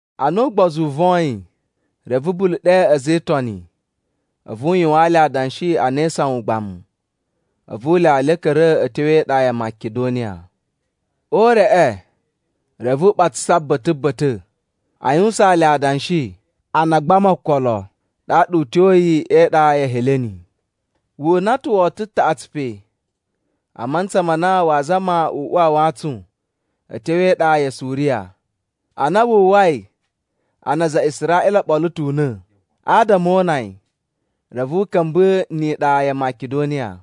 Ana ugbozu u voyin, reve Bulu ɗe a̱za̱ e Itoni a̱vu u yuwaan le adanshi a na e isawan ugbamu. A̱vu u lyawa le u ka̱ra̱ a̱ tyo e iɗa ya Makidoniya. O ureꞌe, reve u ɓatsasa ba̱ta̱ ba̱ta̱ a yuwusaan le adanshi a na a gbama okolo. Ɗaɗa u tyoyi e iɗa ya̱ Heleni. Wu una ta̱ woto taꞌatsu pe. A mantsa ma na waa zama u uwa a wantsun a̱ tyo e iɗa ya Suriya, ana wu uwwai a na aza a Israꞌila o ɓolo ta̱ una̱ adama o una yi, reve u ka̱mba̱ ni iɗa ya Makidoniya.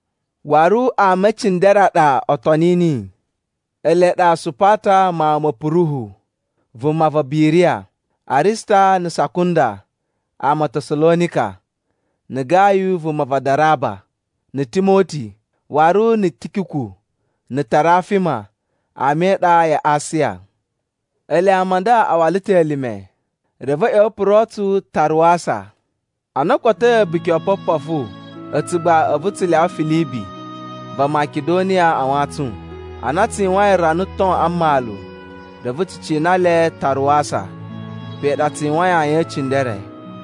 Waru ama e cindere a ɗa o toni niyi. Ele ɗa Supata mawun ma Puruhu vuma va Biriya, Arista na̱ Sakunda ama a Tasalonika, na̱ Gayu vuma va Daraba, na̱ Timoti, waru na̱ Tikiku na̱ Tarafima ama e iɗa ya Asiya. Ele ama a nda a wala ta̱ elime, reve a̱ ꞌya̱wa̱ o puro tsu Taruwasa. Ana o kotoi A̱buki o Opopofu, a̱tsu gba a̱vu tsu lyawa Filibi va Makidoniya a wantsun. Ana tsu yuwain rana ton a mmalu, reve tsu cina le Taruwasa. Pe ɗa tsu yuwain ayin e cindere.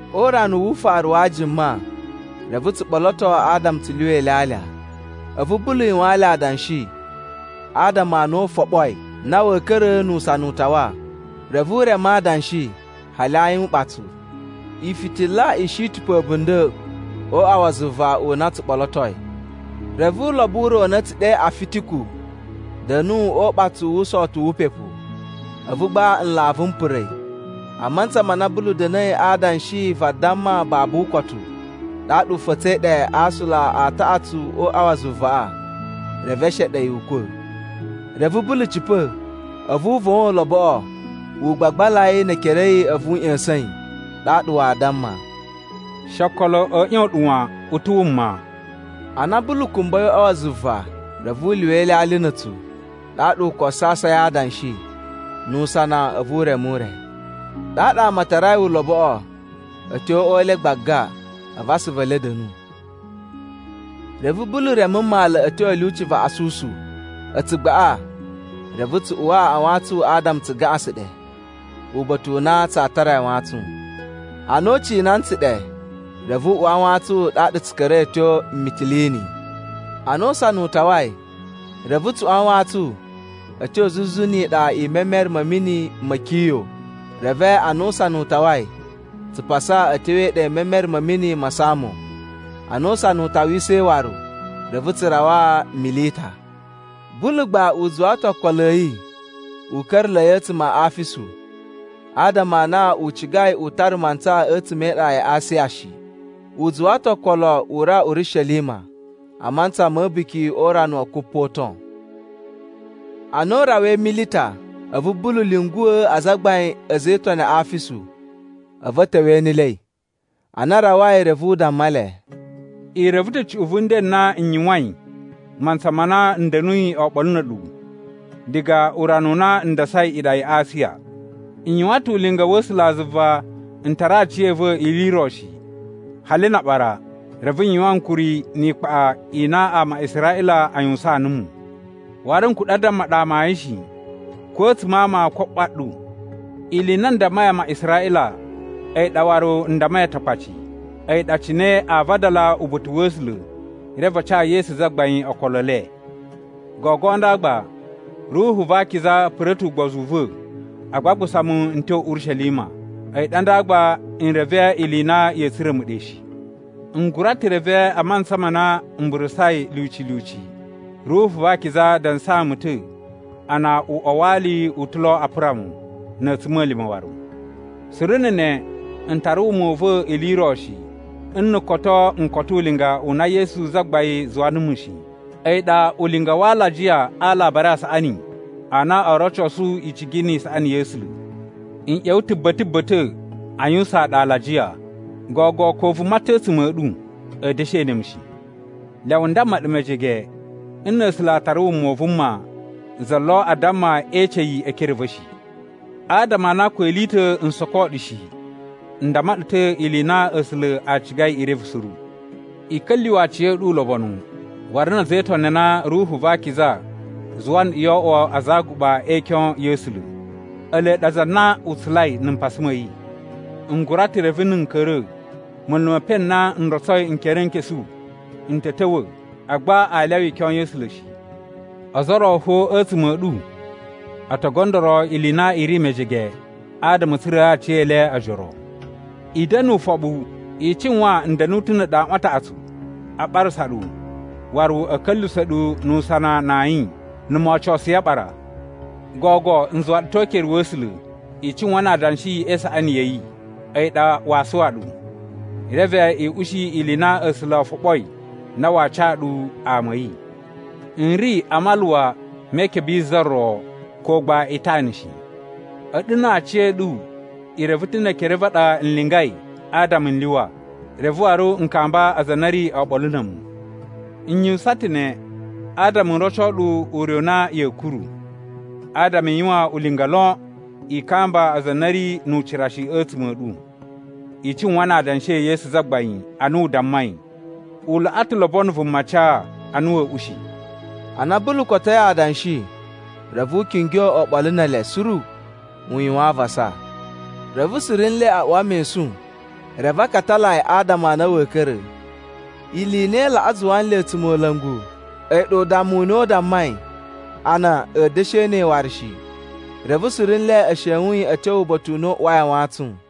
O urana wu ufaru wa ajuma, reve tsu ɓoloto adama tsu lyuwa ilyalya. A̱vu Bulu yuwaan le adanshi adama a na u foɓoi na wa̱a̱ ka̱ra̱ nu usana u tawa. Reve u reme adanshi hali ayin uɓatsu. Ifitila i shi ta̱ pe a̱bunda̱ o uꞌwa wa zuva u na tsu ɓolotoi. Reve ulobo u ro u na a̱ tsu ɗe Afitiku da̱nu o uɓatsu wu usowoto wu upepu. A̱vu gba nlavu m pura̱ yi a mantsa ma na Bulu da̱na̱i adanshi vadamma babu ukotu. Ɗaɗa u fa̱tsa̱i ɗe a aasula a taꞌatsu o uꞌwa wa zuvaꞌa. Reve e sheɗe yi ukwa̱. Reve Bulu cipa̱, a̱vu u vowon uloboꞌo u gbagbala yi ne ekere a̱ yi a̱vu u ꞌya̱sa̱n yi. Ɗaɗa waa damma, “She okolo a̱ ꞌyon ɗu wan! U ta̱ wuma.” Ana Bulu kumbai o uꞌwa wa zuva, reve u lyuwa ilyalya na̱ a̱tsu. Ɗaɗa u koso asai a adanshi, nu usana a̱vu u reme ure. Ɗaɗa ama a tarai uloboꞌo a̱ tyo o uꞌwa u le gbaga, a̱vu asuvu e le a̱ da̱nu. Reve Bulu reme mmalu a̱ tyo a̱ lyuci va Asusu. A̱tsu gbaꞌa reve tsu uwa a wantsun adama tsu gaꞌasan ɗe, uba̱ta̱ u na tsaa tara yi a wantsun. Ana u cina ntsu ɗe, reve u uwa a wantsun ɗaɗa tsu ka̱ra̱i a̱ tyo Mitilini. Ana usana u tawai, reve tsu uwa wantsun a̱ tyo zuzu ni iɗa i memere ma̱ mini ma̱ Kiyo. Reve ana usana u tawai, tsu pasa a̱ tyo e iɗa i memere ma̱ mini ma Samo. Ana usana u tawisai waru, reve tsu rawa Milita. Bulu gba u zuwa ta̱ okolo a̱ yi u ka̱ra̱la̱i a̱tsuma̱ a Afisu, adama a na u cigai u tara mantsa a̱tsuma̱ e iɗa ya Asiya shi. U zuwa ta̱ okolo u rawa Urishelima a mantsa ma̱ A̱buki o Urana wa Kupoton. Ana u rawai Milita, a̱vu Bulu lyunguwa̱ azagbain a̱ a̱za̱ e Itoni a Afisu, a̱vu a̱ ta̱wa̱ e enelei. Ana a rawai, reve u damma le, “I reve ta̱ cuꞌun vu nden n na n yuwain mantsa ma na n da̱nuyi oɓolo na̱ a̱ɗu, diga urana u na n dasai iɗa ya Asiya. N yuwan ta̱ ulinga wa̱ A̱sulazuva n tara aciya̱va̱ ili i ro shi, hali na aɓara. Reve n yuwan ankuri ni ikpaꞌa i na ama a Israꞌila a yuwusaan numu. Waru n kuɗa̱ a damma ɗu amayun shi, ko a̱tsuma̱ a ama ko a ꞌwa ɗu. Ili i na n dammai ama a Israꞌila a̱yi ɗa waru n dammai Atakpaci, a̱yi ɗa cine aa vadala uba̱ta̱ wa̱ A̱sula̱, reve a ca Yesu Zagbain okolo e le. “Gogo nda gba, Ruhu va Akiza pura̱ ta̱ ugbozu u va̱ a gbagbusa mu n tyo Urishelima. A̱yi ɗa nda gba n reve ili i na ya̱a̱ tsura̱ mu ɗe shi. N gura ta̱ reve a mantsa ma na m burusai lyuci lyuci, Ruhu va Akiza dansaa mu ta̱ a na uꞌwa wa ali u ta̱ lo a pura mu, na̱ a̱tsuma̱lima̱ waru. Suru na̱ ne, n tara wuma u va̱ ili i ro shi nna̱ koto n koto ulinga u na Yesu Zagbain zuwa numu shi. A̱yi ɗa ulinga wa alajiya a Alabari a Saꞌani a na oo rocosu icigi ni isaꞌani ya̱ A̱sula̱. “N ꞌya̱wa̱ ta̱ ba̱ta̱ ba̱ta̱ a yuwusaan ɗu alajiya, gogo ko vuma ta̱ a̱tsuma̱ a̱ ɗu a̱a̱ da̱shi ene mu shi. Lyawa n damma ɗu mejege, nna̱ A̱sula̱ a tara wuma u vuma, za lo a damma ee ece yi e ekere a̱ va̱ shi. Adama a na ko ili i ta̱ n soko ɗu shi n damma ɗu ta̱ ili i na A̱sula̱ a cigai i reve suru. I ka̱lyuwa̱ aciya̱ɗu ulobonu waru na̱ a̱za̱ e Itoni a na Ruhu va Akiza zuwa nɗu yo oꞌwo aza a aguɓa e ikyon ya̱ A̱sula̱. Ele ɗa aza a na u tsulai na̱ mpasa ma̱ yi. N gura ta̱ reve na̱ n ka̱ra̱, munlu me epen n na n rotsoi nkerenkesu n ta̱ ta̱wa̱ agba aa lyawa ikyon ya̱ A̱sula̱ shi. Ozo o ro fo a̱tsuma̱ a̱ ɗu o to gondoro ili i na i ri mejege adama a̱ tsura̱a̱ aciyele ojoro. I da̱na̱ ufoɓu! I cuwan n da̱nu ta̱ na̱ a̱ɗu aꞌwan a taꞌatsu a ɓarasa ɗu waru a̱ ka̱lyuwusa̱ ɗu nu usana na ayin, na̱ moo ocosuyi aɓara. “Gogo n zuwa ɗu ta̱ o ukere wa̱ A̱sula̱. I cuwan na adanshi e isaꞌani ya̱ yi! A̱yi ɗa waa suwa ɗu, reve i ushi ili i na A̱sula̱ o foɓoi na waa ca ɗu ama a̱ yi. “N ri a maluwa me ikebe yi za ro, ko gba itana shi. A̱ɗu na aciya̱ɗu i reve ta̱ ne ekere a̱ va̱ a ɗa n lingai adama n lyuwa, reve waru n kamba aza a na a̱ ri oɓolo na̱ a̱mu. N yuwusan ta ne adama n roco ɗu ure u na ya̱a̱ kuru, adama i yuwan ulinga lon i kamba aza a na a̱ ri nu ucira shi a̱tsuma̱ a̱ ɗu. I cuwan na adanshi e Yesu Zagbain ana u dammai, ‘U laꞌa ta̱ lobono vuma ca, ana wa̱a̱ ushi.’” Ana Bulu kotoi adanshi, reve u kingyo oɓolo ne ele suru u yuwan avasa. Reve suru nle a uwa mesun, reve a katala yi adama a na wa̱a̱ ka̱ra̱. Ili i na i laꞌa zuwa nle a̱tsumola̱ngu, a̱yi ɗa udammu u na u dammai a na a̱a̱ da̱shi ene yi waru shi. Reve suru nle e shewun yi a̱ tyo uba̱ta̱ u na u uwai a wantsun.